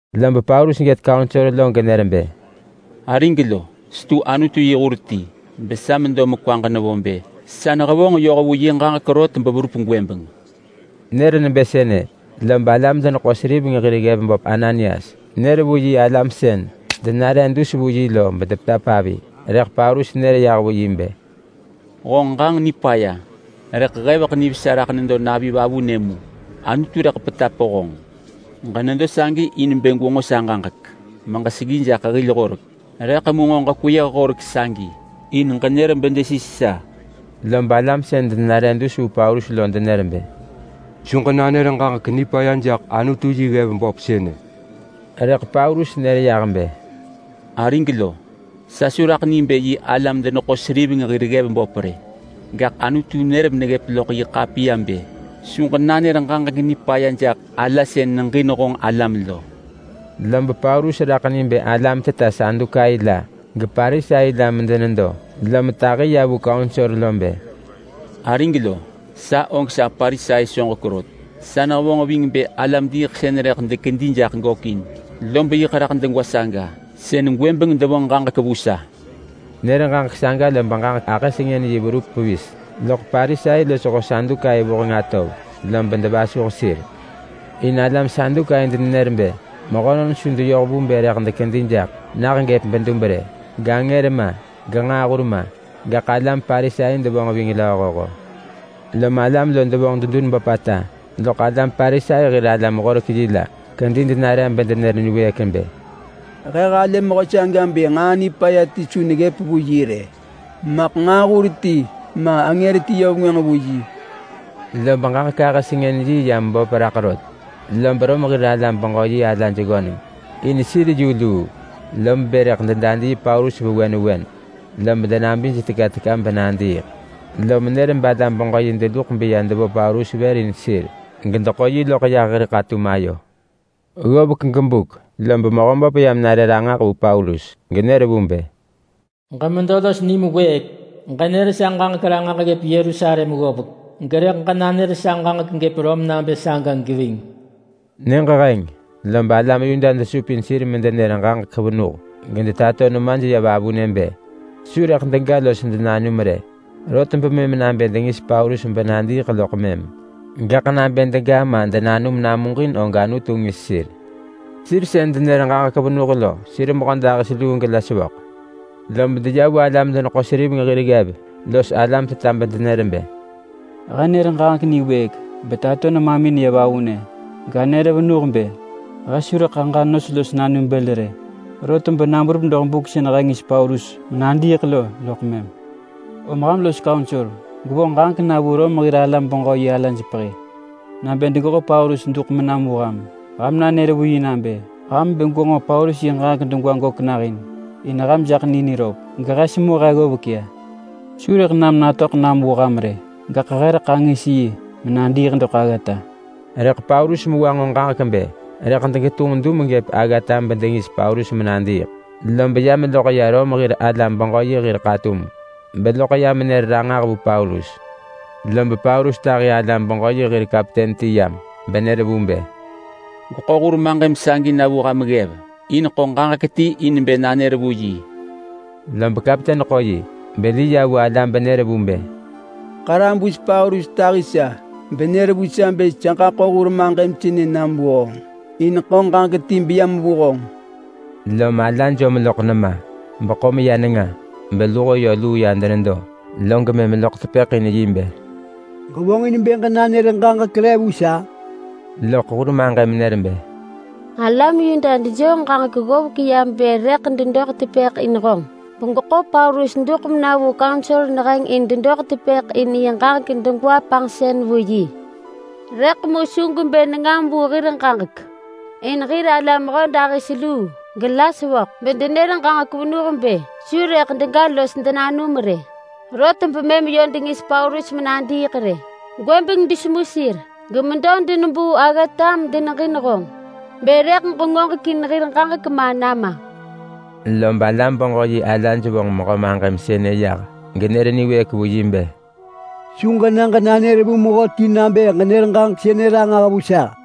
Lob Paulus gët kaunsor genër bë, “Arig lo, setu Anutu yi hur ti besa medo mekwaġ nevo bë sa nehevonġ yoh vu yi ġaġek rot beverup gwëbeng!” Nër nebë sënë, lob alam-deneḳo-seriveng hir ggev böp Ananias nër vu yi alam sën denare dus vu yi lo bedepetap avi. Rëḳ Paulus nër yah vu yi bë, “Honġ ġanġ nipaya rëḳ heveḳ nivesa raḳ nedo navi vavunë mu! Anutu rëḳ petap honġ! Ġenedo sagi in bë gwenġo sa ġaġek meġeseggi jaḳ hil horek, rëḳ mu nġo kweyëh horek sagi in ġenër bedesis sa!” Lob alam sën denare dus vu Paulus lo denër bë, “Su ġenanër ġaġek nipaya jaḳ Anutu yi ggev böp sënë!” Rëḳ Paulus nër yah bë, “Arig lo, sa su raḳ ni bë yi alam-deneḳo-seriveng hir ggev böp rë. Gaḳ Anutu nër meneggëp loḳ yi ḳapiya bë: Su ġenanër ġaġek nipaya jaḳ ala sën neġin honġ alam lo!” Lob Paulus raḳ ni bë alam teta Sadukai la geParisai la medenedo, lom tahi ya vu kaunsor bë, “Arig lo! Sa og sa Parisai soġek rot! Sa nehevonġ ving bë alam-diiḳsën rëḳ dekedi jaḳ gökin, lob yiḳ raḳ degwa saga sën gwëbeng devonġ ġaġek vu sa.” Nër ġaġek saga lob ġaġek ahë sengën yi verup pevis loḳ Parisai losho Sadukai vuheng atov, lob devasuh sir. In alam Sadukai denenër bë mehönon su deyoh vu bë rëḳ dekedi jaḳ nah gëp bedub rë, gangër ma, genġaahur ma. Gaḳ alam Parisai devonġ ving lööhoho. Lom alam lo devonġ dedun böpata, loḳ alam Parisai hir alam-horek-yi la kedi denare bedenër niwëëk bë, “He halë mehö saga bë nġaa nipaya ti su neggëp vu yi rë! Maḳ nġaahur ti ma angër ti yö vengwënġ vu yi!” Lob ġaġek ahë-sengën-yi ya meböp raḳ rot, lob Rom hir alam-beġö-yi alaj ggöneng. In sir yu luu, lob bë rëḳ dedadii Paulus vewen vewen lob denabij teka teka benadiiḳ. Lom nër balam-beġö-yi deluḳ beya devo Paulus vër in sir gedeḳo yi loḳ yah hir ḳatum ayo. Ggovek gebuk lob Mehöböp yam nare ranġah vu Paulus genër vu bë, “Ġemedo los nim wëëk! Ġenër sa ġaġek ranġah ggëp Yerusalem ggovek, gerëḳ ġenanër sa ġaġek gëp Rom nabë saga geving.” Nyëġ heng lob alam Yuda desupin sir medenër ġaġek venuh gedetato nemaj ya vavunë bë su dega los denanum rot bemëm nabë dengis Paulus benadiiḳ loḳ mëm. Gaḳ nabë dega ma denanum namuġin og Anutu ngis sir. Sir sën denër ġaġek venuh lo sir mehödahis luu gela sevöḳ. Lob deya vu alam-deneḳo-seriveng hir ggev los alam teta bedenër bë, “He nër ġaġek niwëëk betato nemamin ya vavunë ganër venuh bë he su rëḳ aġa nos los nanum bël rë rot, bena berup doḳ buk sën he ngis Paulus menadiiḳ lo loḳ mëm. Om ham los kaunsor gwevonġ ġaġek na vu Rom hir alam-beġö-yi alaj pehi nabë degeḳo Paulus duḳ menam vu ham. Ham nanër vu yi nabë ham bë gwenġo Paulus yi ġaġek degwa gök nahin in ham jaḳ ni niröp. Gehe semu he ggovek ya. Su rëḳ nam natöḳ nam vu ham rë, gaḳ he rëḳ angis yi menadiiḳ doḳ aggata!” Rëḳ Paulus mewa nġo ġaġek bë rëḳ degetunġ dum gëp aggata bedengis Paulus menadiiḳ, lob ya meloḳ ya Rom hir alam-beġö-yi hir ḳatum beloḳ ya menër ranġah vu Paulus. Lob Paulus tahi alam-beġö-yi hir kapten ti yam, benër vu bë, “Gweḳo hur maġëm sagi na vu ham ggev, in ḳo ġaġek ti in bë nanër vu yi.” Lob kapten ḳo yi beli ya vu ala benër vu bë, “Ḳarabus Paulus tahi sa benër vu sa bë sa ġaḳo hur maġëm sënë nam vu honġ, in ḳo ġaġek ti beyam vu honġ.” Lom ala jom loḳ nema, beḳo meya nenga, beluho yö luu ya denedo, log mëm loḳ tepëḳ in yi bë, “Ġevonġin bë ġenanër ġaġek re vu sa?” Loḳ hur maġëm nër bë, “Alam Yuda dejoo ġaġek ggovek bë rëḳ dedoḳ tepëḳ in honġ begweḳo Paulus duḳ mena vu kaunsor neheng in dedoḳ tepëḳ in yi ġaġek degwa panġsën vu yi. Rëḳ mu su gwebë nengam vu hir ġaġek, in hir alam mehödahis luu gela sevöḳ bedenër ġaġek venuh bë su rëḳ dega los denanum rë, rot bemëm yö dengis Paulus menadiiḳ rë. Gwëbeng desemu sir gemedo denebuu aggata medeneġin honġ bë rëḳ ġengoġekin hir ġaġek ma nama.” Lob alam-beġö-yi alaj vonġ mehö maġëm sënë yah, genër niwëëk vu yi bë, “Su ġena ġenanër vu mehöti nabë ġenër ġaġek sënë ranġah vu sa!”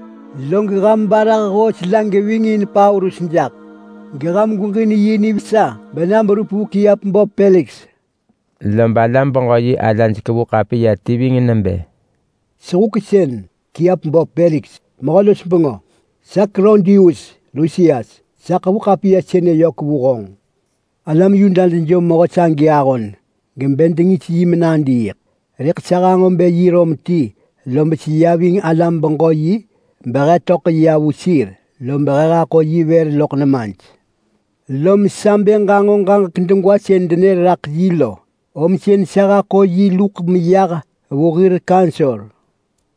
Log ham barah hoos la geving in Paulus jaḳ, geham gweġin yi nivesa bena berup vu kiap böp Peliks.” Lob alam-beġö-yi alaj kevu ḳapiya ti ving nebë: Sehuksën! Kiap böp Peliks, mehö-los-bengö! Sa Klaudius Lusias, sa ḳevu ḳapiya sënë yök vu honġ. Alam Yuda dejom mehö sagi ahon gebë dengis yi menadiiḳ, rëḳ sa hanġo bë yi Rom ti lob seya ving alam-beġö-yi behe töḳ ya vu sir, lob he haḳo yi vër loḳ nemaj. Lom sa bë ġanġo ġaġek degwa sën denër raḳ yi lo, om sën sa haḳo yi luḳ meyah vu hir kaunsor.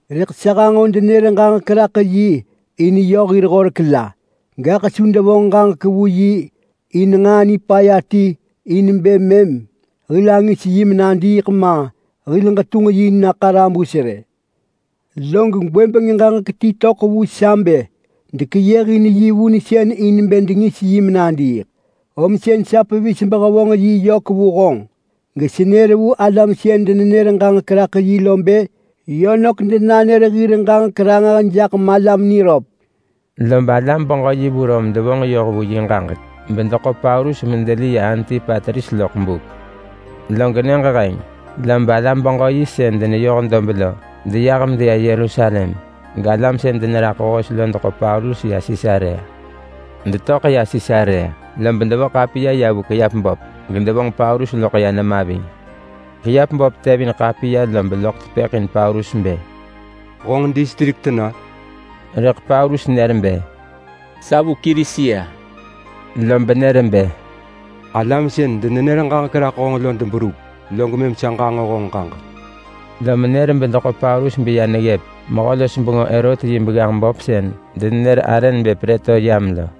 Rëḳ sa hanġo denër ġaġek raḳ yi in yö hir horek la. Gaḳ su devonġ ġaġek vu yi in nġaa nipaya ti in bë mëm hil angis yi menadiiḳ ma, hil ġetunġ yi na ḳarabus rë. Log gwëbeng ġaġek ti töḳ vu sa bë dekeyëhin yi vunsën in bë dengis yi menadiiḳ. Om sën sa pevis behevonġ yi yök vu honġ, gesenër vu alam sën denenër ġaġek raḳ yi lo bë yö nök denanër hir ġaġek ranġah jaḳ malam niröp. Lob alam-beġö-yi vu Rom devonġ yoh vu yi ġaġek, bedeḳo Paulus medeli ya Antipatris loḳ buk. Log nyëġ heng lob alam-beġö-yi sën deneyoh dob lo deyah medeya Yerusalem, galam sën deneraḳ hoos lo deḳo Paulus ya Sisarea. Detöḳ ya Sisarea, lob devo ḳapiya ya vu kiap böp gedevonġ Paulus loḳ ya nema ving. Kiap böp tevin ḳapiya lob loḳ tepëḳ in Paulus bë, “Honġ distrik tena?” Rëḳ Paulus nër bë, “Sa vu Kilisia.” Lob nër bë, “Alam sën denenër ġaġek raḳ honġ lo deberup, log mëm sa ġanġo honġ ġaġek.” Lom nër bedeḳo Paulus beya neggëp mehö-los-bengö Herot yi begganġ böp sën denenër arë nebë Prëtoryam lo.